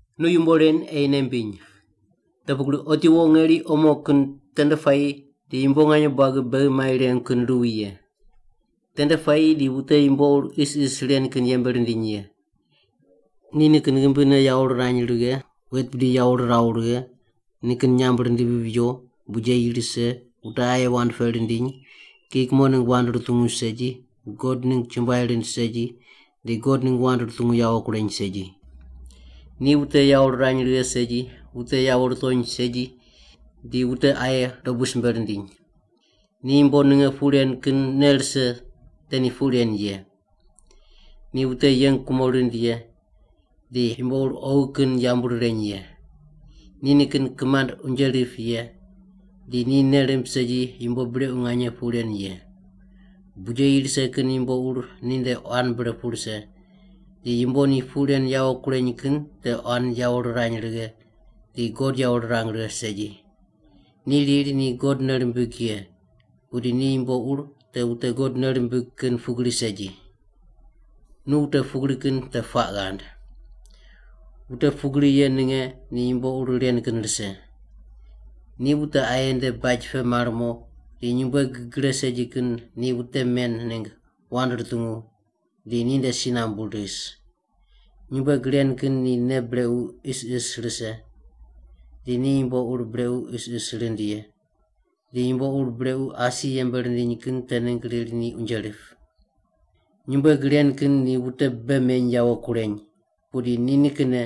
Nu yumbo ren ei nei mbiny. Te pugri otiwo ngeri omo kin tende puayi di yumbo nganye buagi beghi mai rengu kin ruwi ye. Tende puayi di wute yumbo ur isis ren kin yembe rindiny ye. Ni nikin ghimbine yawo rirany righe, wet bidi yawo riraw righe, nikin nyamb rindivi riwo, bijeyi rise, wute aye wand peq rindiny, kiyi kumo ningg wand rutungu segi, God ningg chumbuai rind segi, di God ningg wand rutungu yawo kureny segi. Ni wute yawo rirany righe segi, wute yawo rutony segi, di wute aye dobu simbe rindiny. Ni yumbo ninge puq ren kin nei rise te ni puq ren ye. Ni wute yeng kumo rind ye, di yumbo ur oghi kin yambu rireny ye. Ni nikin kimand unje rip ye, di ni nei rimb segi yumbo brequ nganye puq ren ye. Bijeyi rise kin yumbo ur ninde quan bre pu rise di yumbo ni puq ren yawo kureny kin te quan yawo rirany righe di God yawo rirang righe segi. Ni riri ni God nei rimbig ye, pudi ni yumbo ur te wute God nei rimbig kin pugri segi. Nu wute pugri kin te puaq ghand. Wute pugri ye ninge ni yumbo ur ren kin rise. Ni wute aye nde baj pe mar mo di nyumbueg gre segi kin ni wute men ningg wand rutungu di ninde si nambu ris. Nyumbueg ren kin ni nei brequ isis rise di ni yumbo ur brequ isis rind ye, di yumbo ur brequ asi yembe rindiny kin te ningg riri ni unje rip. Nyumbueg ren kin ni wute bei meny yawo kureny, pudi ni nikinne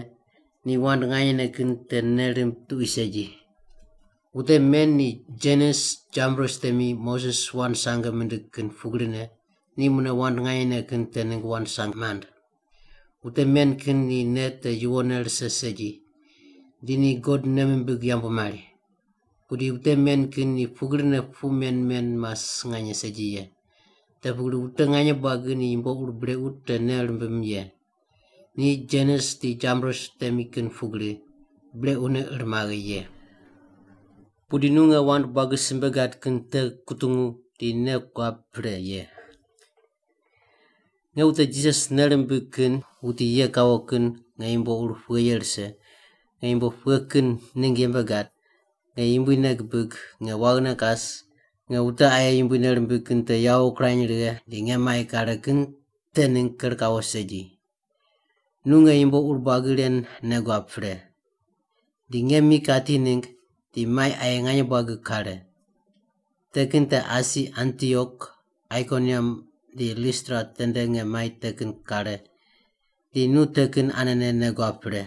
ni wand nganyene kin te nei rimb tuqui segi. Wute men ni Janes Jambres temi Moses wand sange mindig kin pugrine, ni mune wand nganyene kin te ningg wand sange mand. Wute men kin ni nei te yuwonne rise segi, di ni God nei mimbig yambu mari. Pudi wute men kin ni pugrine puq men men mas nganye segi ye. Te pugri wute nganye buagi ni yumbo ur brequ te nei rimbim ye. Ni Janes di Jambres temi kin pugri, brequne ir maghe ye. Pudi nu nge wand buagi simbe gad kin te kutungu di nei guab pre ye. Nge wute Jisas nei rimbig kin wuti ye kawo kin nge yumbo ur pughe ye rise, nge yumbo pughe kin ningg yembe gad, nge Yumbui nei gibig, nge waghine kas, nge wute aye Yumbui nei rimbig kin te yawo kirany righe di nge mai kare kin te ningg ker kawo segi. Nu nge yumbo ur buagi ren nei guab pre. Di nge mi kati ningg, di mai aye nganye buagi kare. Te kin te asi Antiok, Aikoniam di Listra tende nge mai te kin kare di nu te kin anene nei guab pre.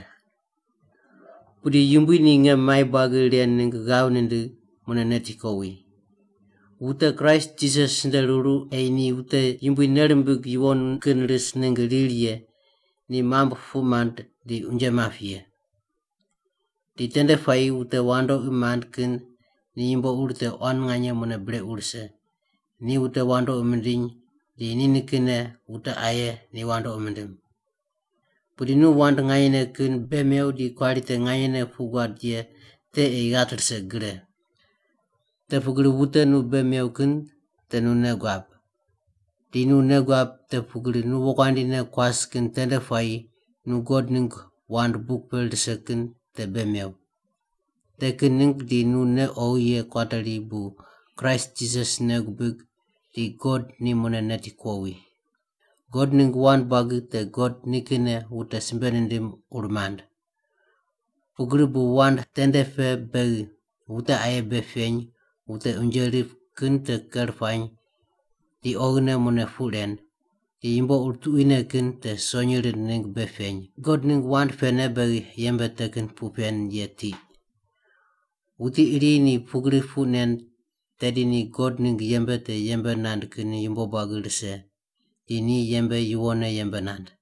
Pudi Yumbui ni nge mai buagi ren ningg ghav nindigh, mune neti kowi. Wute Kraist Jisas nde ruru ei ni wute Yumbui nei rimbig yuwon kin ris ningg riri ye ni mambui puq mand di unje map ye. Di tende puayi wute wandoqi mand kin ni yumbo ur te quan nganye mune brequ rise, ni wute wandoqi mindiny di ni nikinne wute aye ni wandoqi mindim. Pudi nu wand nganyene kin bei mew di kuari te nganyene puq guad ye te ei ghat rise gre. Te pugri wute nu bei mew kin te nu nei guab. Di nu nei guab te pugri nu wokuandi ne kuas kin tende puayi nu God ningg wand buk pe rise kin te bei mew. Te kin ningg di nu nei oghi ye kuateri bu Kraist Jisas nei gubig di God ni mune neti kuowi. God ningg wand buagi te God nikinne wute simbe nindim ur mand. Pugri bu wand tende pe beghi wute aye bei peny, wute unje rip kin te ker puany di oghine mune puq ren, di yumbo ur tuquine kin te sonyi rind ningg bei peny God ningg wand pene beghi yembe te kin puq pen ye tiq. Wuti iri ni pugri puq nen tedi ni God ningg yembe te yembe nand kin yumbo buagi rise di ni yembe yuwonne yembe nand.